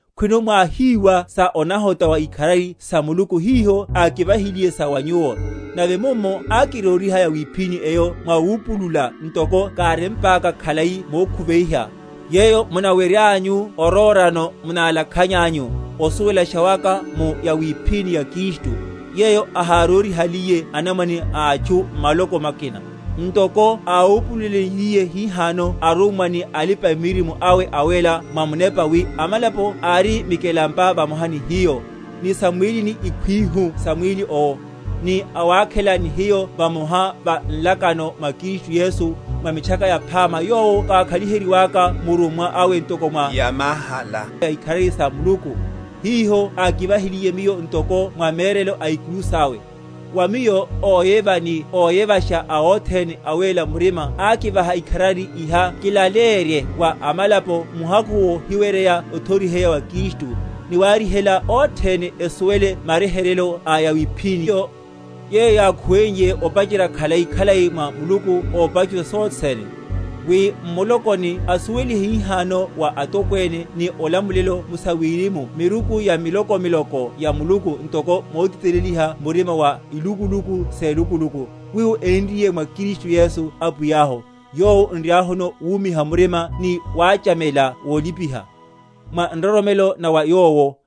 khwino mwáhiwa sa onahota wa ikharari sa Muluku hiho ákivahiliye sa wa nyuwo: nave mummo ákiróriha yawiphíni eyo mwa wupulula, ntoko kárempaka khalai mokhuveiha, yeyo munaweryanyu orórano, munalakhanyanyu, osuwelasha waka mu yawiphíni ya Kristu, yeyo ahárórihaliye anamwane a atchu m’maloko makina, ntoko áwupululenliye hihano arummwa ni alipa‐miririmo awe awéla mwa Munepa, wi amalapo ari mikelampa vamoha ni hiyo, ni sam’mwílini ikhwihu sa mwíli owo, ni awakhela ni hiyo vamoha va nlakano mwa Kristu Yesu, mwa Mitchaka Yaphama, yowo kákhaliheliwaka murummwa awe ntoko mwa yamahala ya ikharari sa Muluku, hiho ákivahiliye miyo, ntoko mwa merelo a ikuru sawe. Wa miyo óyeva ni óyevasha a othene awéla murima ákivaha ikharari iha kilaleyerye wa amalapo muhakhu wohiwerya othoriheya wa Kristu; ni waryihela othene esuwele maryeheryeyo a yawiphíníyo, yeyo yákhuweiye opacherya khalai‐khalai mwa Muluku ópachusha sothe sene; wi m’mulokoni asuwelihe hihano wa atokwene ni olamulelo mu sawirimu miruku ya miloko miloko ya Muluku, ntoko motiteleliha murima wa ilukuluku?-?selukuluku, wiwo énriye mwa Kristu Yesu Apwiyahu: yowo n’riahuno wumiha murima ni wachamela wolipiha, mwa nroromelo na va Yowo.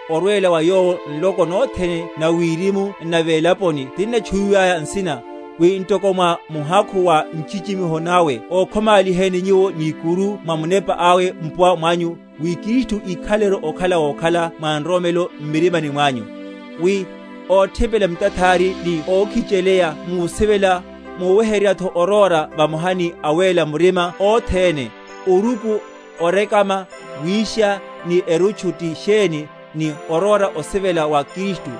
orwela wa Yowo nloko nothene na wirimu n’na velaponi tinnatchuwiwaya nsina, wi ntoko mwa muhakhu wa nchichimiho nawe ókhomáliheni nyuwo ni ikuru mwa Munepa awe, mpuwa mwanyu, wi Kristu íkhaleleru okhala wokhala mwa nroromelo m’mirima mwanyu; wi, óthipela mitathari ni ókhicheleya musivela, muweryetho oróra vamoha ni awéla murima othene, oruku, orekama, wisha, ni erutchu ti sheni; ni oróra osivela wa Kristu,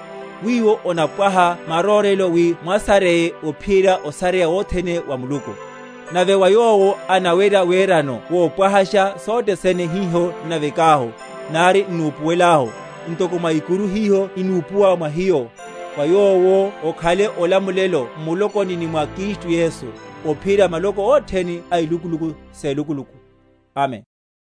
wiwo onapwaha marórelo, wi mwasaryeye ophiyerya osaryeya wothene wa Muluku. Nave wa Yowo anawerya werano wopwahashasha sothe sene hiho n’navekahu, nari n’nupuwelelahu, ntoko mwa ikuru hiho inúpa mwa hiyo, wa Yowo okhale olamulelo m’mulokoni ni mwa Kristu Yesu, ophiyerya maloko othene a ilukuluku selukuluku. Amen.